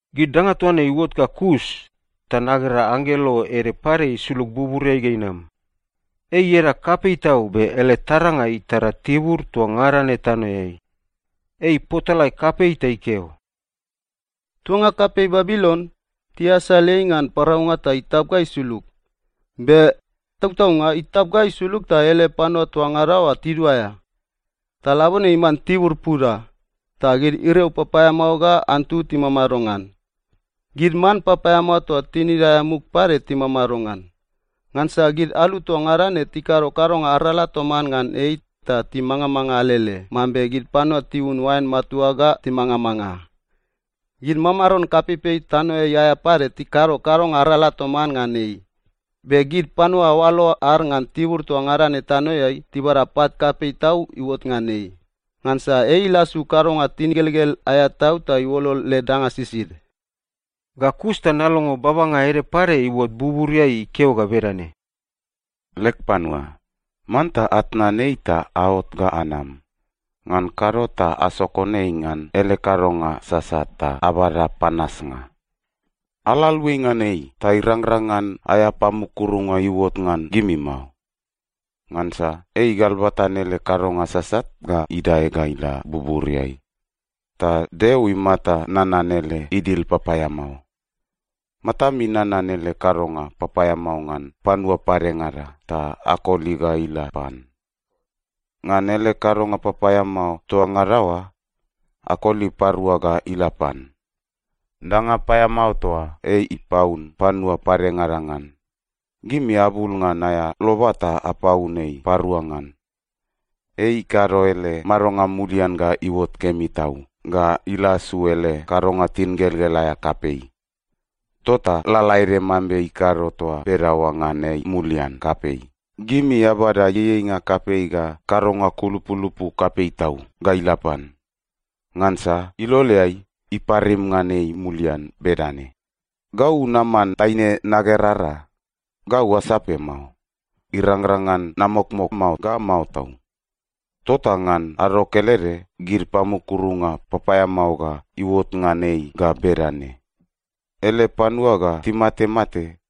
Gid danga toa ne iuot ga kus, ta nagera anggelo ede pade isulug buburiai ga inam. Ei ieda kapei tau be ele taranga itara tibur toa ngada ne tanoeai. Ei ipotalae kapei ta ikeo, “Tuanga kapei Babilon, tiasal ei ngan paraunga ta itap ga isulug! Be, tautaunga itap ga isulug ta ele panua toa ngada oa tiduaea! Ta labone iman tibur puda, ta gid iriau papaeamao ga antu timamado ngan. Gid man papaeamao toa tinid aea muk pade timamado ngan. Ngansa gid alu toa ngada ne tikado kadonga arala toman ngan ei ta timangamanga alele mambe gid panua tiun oain matua ga timangamanga. Gid mamaron kapeipei tanoeai aea pade tikado kadonga arala toman ngan ei. Be gid panua oalo ad ngan tibur toa ngada ne tanoeai tibada pat kapei tau iuot ngan ei, ngansa ei ilasu kadonga tingelgel aea tau ta iuolol led danga sisid.” Ga kus ta nalongo babanga ede pade iuot buburiai ikeo ga bedane, “Leg panua, manta atnan ei ta aot ga anam! Ngan kado ta asokon ei ngan ele kadonga sasat ta abada panasnga. Ala aluai ngan ei ta irangrang ngan aea pamukurunga iuot ngan gimi mao. Ngansa ei igalbatan ele kadonga sasat ga idae ga ila buburiai, ta Deo imata nanan ele idil papaeamao. Matami nanan ele kadonga papaeamao ngan panua padengada ta akoli ga ila pan. Ngan ele kadonga papaeamao toa ngada oa, akoli parua ga ila pan. Danga paeamao toa ei ipaun panua padengada ngan, gimi abul ngan aea loba ta apaun ei parua ngan. Ei ikado ele madonga mulian ga iuot kemi tau ga ilasu ele kadonga tingelgel aea kapei. Tota lalaede mambe ikado toa bedaoa ngan ei mulian kapei, gimi abada ieieinga kapei ga kadonga kulupulupu kapei tau ga ila pan. Ngansa iloleai, iparim ngan ei mulian bedane: ‘Gau naman taine nagerara. Gau asape mao. Irangrang ngan namokmok mao ga mao tau!’ Tota ngan ado kelede gid pamukurunga papaeamao ga iuot ngan ei ga bedane: ele panua ga timatemate,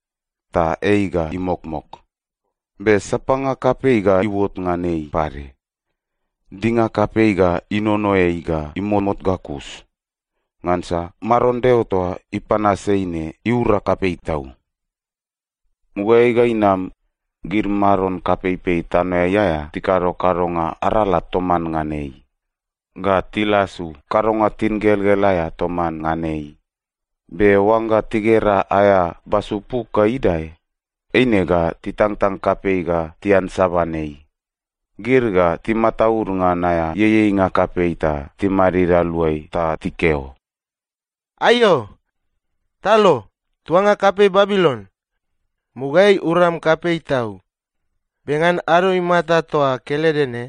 ta ei ga imokmok, be sapanga kapei ga iuot ngan ei pade. Dinga kapei ga inono ei ga imomout ga kus, ngansa Maron Deo toa ipanas ei ne iura kapei tau. “Mugaeai ga inam, gid mamaron kapeipei tanoeai aea tikado kadonga arala toman ngan ei ga tilasu kadonga tingelgel aea toman ngan ei. Be oangga tigera aea basu puk ga idae, eine ga titangtang kapei ga tiansaban ei. Gid ga timataud ngan aea ieieinga kapei ta timadid aluai ta tikeo, “‘Aiao! Talo, tuanga kapei Babilon! Mugaeai uram kapei tau. Be ngan ado imata toa kelede ne,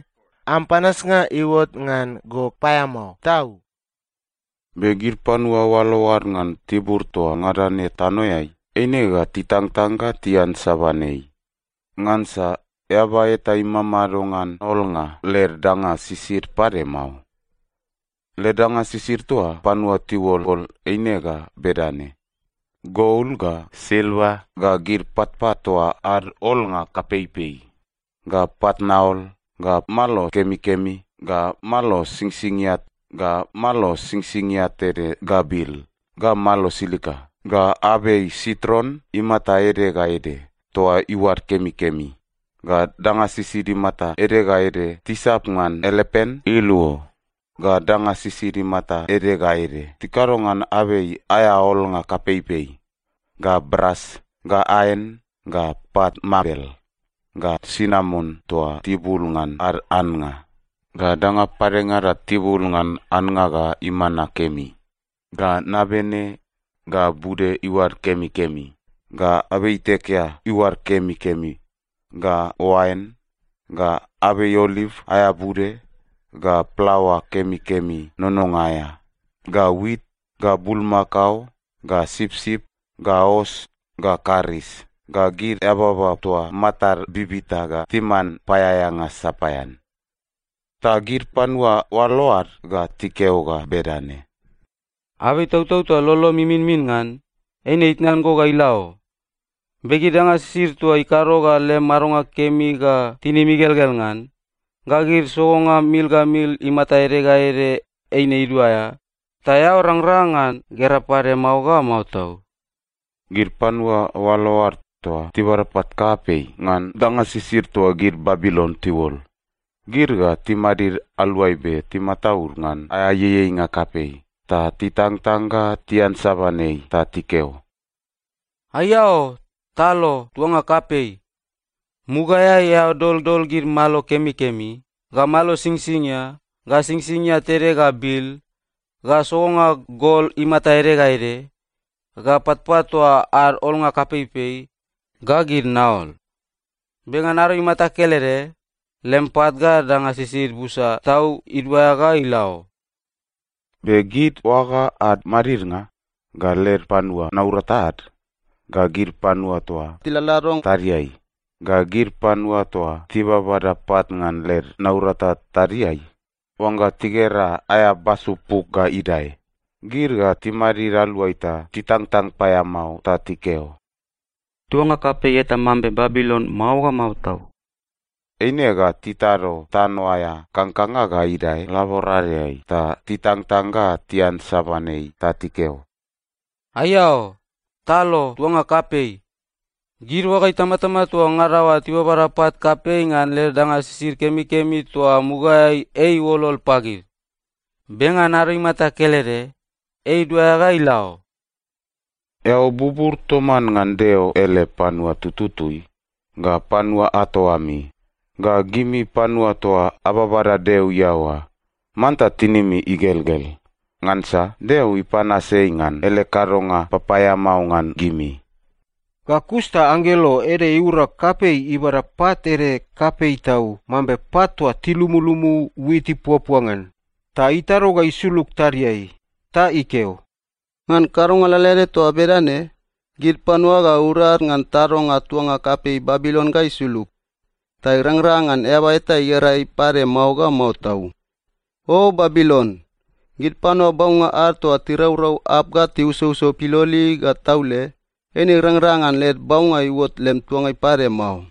am panasnga iuot ngan go paeamao tau!’ “Be gid panua oalo ad ngan tibur toa ngada ne tanoeai eine ga titangtang ga tiansaban ei, ngansa eaba eta imamado ngan olnga led danga sisid pade mao. Led danga sisid toa panua tiuolol eine ga bedane: gol, ga silva, ga gid patpat toa ad olnga kapeipei, ga pat naol, ga malo kemikemi, ga malo singsingia, ga malo singsingia tede ga bil, ga malo silika, ga abei sitron imata ede ga ede toa iuad kemikemi, ga danga sisid imata ede ga ede tisap ngan elepan iluo, ga danga sisid imata ede ga ede tikado ngan abei aea olnga kapeipei, ga bras, ga aen, ga pat mabel, ga sinamon toa tibul ngan ad annga, ga danga padengada tibul ngan annga ga imana kemi, ga nabene, ga bude iuad kemikemi, ga abei itekea iuad kemikemi, ga oain, ga abei oliv aea bude, ga plaoa kemikemi nononga aea, ga wit, ga bulmakao, ga sipsip, ga os, ga karis, ga gid eababa toa matad bibita ga timan paeaeanga sapaean.” “Ta gid panua oalo ad ga tikeo ga bedane, ‘Abei itautau toa lolom iminmin ngan, eine itnan go ga ila o! Be gid danga sisid toa ikado ga lem madonga kemi ga tinim igelgel ngan, ga gid sogonga mil ga mil imata ede ga ede, eine iduaea, ta eao rangrang ngan gera pade mao ga mao tau.’ Gid panua oalo ad toa tibada pat kapei ngan danga sisid toa gid Babilon tiuol, gid ga timadid aluai be timataud ngan aea ieieinga kapei ta titangtang ga tiansaban ei ta tikeo, “‘Aiao! Talo, tuanga kapei! Mugaeai eao doldol gid malo kemikemi, ga malo singsingia, ga singsingia tede ga bil, ga sogonga gol imata ede ga ede, ga patpat toa ad olnga kapeipei, ga gid naol. Be ngan ado imata kelede, lem pat ga danga sisid busa tau iduaea ga ila o!’ “Be gid oaga ad madidnga, ga led panua naurata ad, ga gid panua toa tiladlado tadiai, ga gid panua toa tibabada pat ngan led naurata tadiai, oangga tigera aea basu puk ga idae, gid ga timadid aluai ta titangtang paeamao ta tikeo, ‘Tuanga kapei eta mambe Babilon mao ga mao tau!’ Eine ga titado tano aea kangkanga ga idae laboradeai ta titangtang ga tiansaban ei ta tikeo, “‘Aiao! Talo, tuanga kapei! Gid oaga itamatama toa ngada oa tibabada pat kapei ngan led danga sisid kemikemi toa mugaeai ei iuolol pagid. Be ngan ado imata kelede, ei iduaea ga ila o!’ “Eao bubur toman ngan Deo ele panua tututui, ga panua ato ami, ga gimi panua toa ababada Deo iaoa, manta tinimi igelgel! Ngansa Deo ipanas ei ngan ele kadonga papaeamao ngan gimi.” Ga kus ta anggelo ede iura kapei ibada pat ede kapei tau mambe pat toa tilumulumu wit ipuapua ngan, ta itado ga isulug tadiai. Ta ikeo, “Ngan kadonga lalaede toa bedane, gid panua ga urad ngan tadonga tuanga kapei Babilon ga isulug. Ta irangrang ngan eaba eta igera ei pade mao ga mao tau. O Babilon! Gid panua baunga ad toa tiraurau arp ga tiusouso piloli ga taule, eine irangrang ngan led baunga iuot lem tuangai pade mao.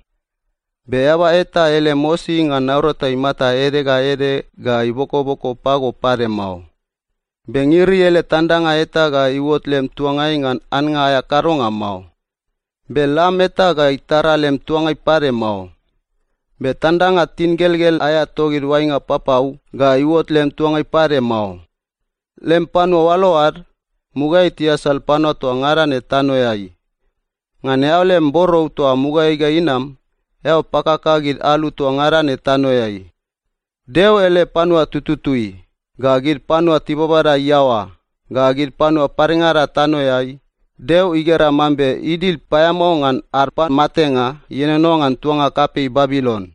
Be eaba eta ele mosi ngan naurata imata ede ga ede ga ibokoboko pago pade mao. Be ngiri ele tandanga eta ga iuot lem tuangai ngan annga aea kadonga mao. Be lam eta ga itara lem tuangai pade mao. Be tandanga tingelgel aea togid oainga papau ga iuot lem tuangai pade mao. Lem panua oalo ad, mugaeai tiasal panua toa ngada ne tanoeai. Ngan eao lem borou toa mugaeai ga inam, eao pakaka gid alu toa ngada ne tanoeai. Deo ele panua tututui, ga gid panua tibabada iaoa, ga gid panua padengada tanoeai, Deo igera mambe idil paeamao ngan ad pamatenga ienono ngan tuanga kapei Babilon.”